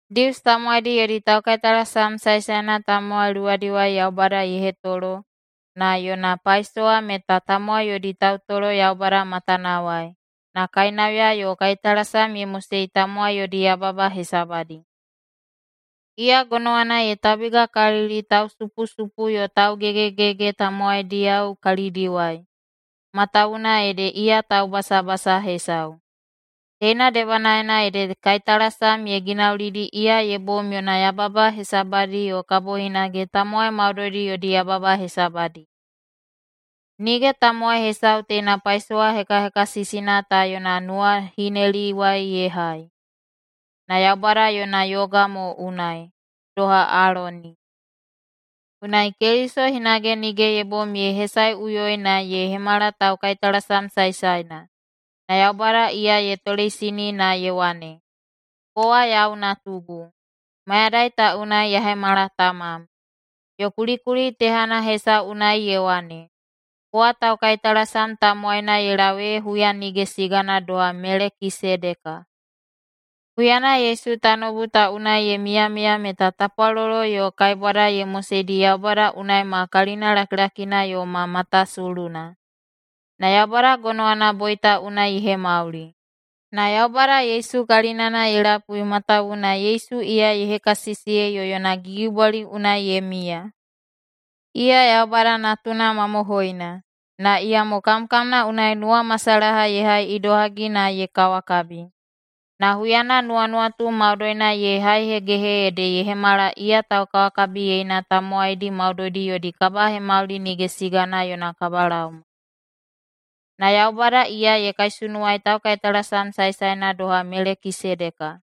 Dius tamowaidi yodi taukaitalasam saesaena tamowai luwadiwai Yaubada ye hetolo na yona paisowa meta tamowai yodi tautolo Yaubada matanawai na kainauya yo kaitalasam ye mosei tamowai yodi yababa hesabadi. Iya gonowana ye taubigakalili tausupusupu yo taugegegege tamowaidiyao kalidiwai, matawuwuna ede iya taubasabasa hesau. Teina debanaena ede kaitalasam ye ginaulidi iya ye bom yona yababa hesabadi yo kabo hinage tamowai maudoidi yodi yababa hesabadi. Nige tamowai hesau teina paisowa hekahekasisina ta yona nuwahineliwai ye hai, na Yaubada yona yoga mo unai, doha Aloni. Unai Keliso hinage nige ye bom ye hesaeꞌuyoi na ye hemala taukaitalasam saesaena, na Yaubada iya ye toleisini na ye wane, “Kowa yau natugu, mayadai ta unai ya hemala tamam.” Yo kulikuli tehana hesau unai ye wane, “Kowa taukaitalasam tamowaina ye lau ee huya nige sigana doha Melekisedeka.” Huyana Yesu tanoubu ta unai ye miyamiya meta tapwalolo yo kaibwada ye moseidi Yaubada unai ma kalina lakilakina yo ma matasuluna, na Yaubada gonowana boita unai ye hemauli. Na Yaubada Yesu kalinana ye lapui matawuwuna Yesu iya ye hekasisiyei yo yona gigibwali unai ye miya. Iya Yaubada Natuna mamohoina, na iyamo kamkamna unai nuwamasalaha ye hai idohagi na ye kawakabi. Na huyana nuwanuwatu maudoina ye haihegehe ede ye hemala iya taukawakabiyeina tamowaidi maudoidi yodi kabihemauli nige sigana yona kabalaoma. Na Yaubada iya ye kaisunuwai taukaitalasam saesaena doha Melekisedeka.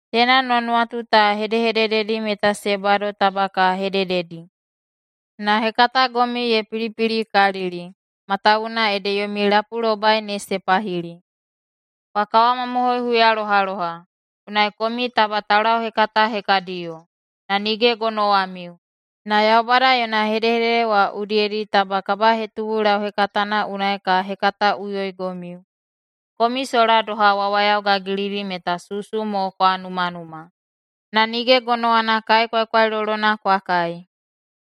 Teina nuwanuwatu ta hedehedededi meta se bado taba ka hedededi, na hekatagomiu ye pilipilikalili, matawuwuna ede yomi lapulobai ne se pahili. Kwa kawamamohoi huyalohaloha, unai komiu taba taulauhekata hekadiyo, na nige gonowamiu, na Yaubada yona hedehedede wa udiyedi taba kabahetubu lauhekatana unai ka hekataꞌuyoigomiu. Komiu sola doha wawayao gagilidi meta susu mo kwa numanuma, na nige gonowana kai kwaikwailolona kwa kai.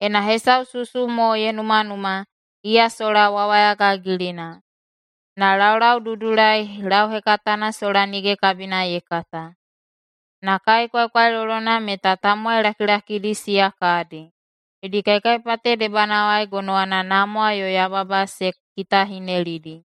Ena hesau susu mo ye numanuma, iya sola wawaya gagilina, na laulaududulai lauhekatana sola nige kabina ye kata. Na kai kwaikwailolona meta tamowai lakilakidi siya kadi. Yodi kaikaipate debanawai gonowana namwa yo yababa se kitahinelidi.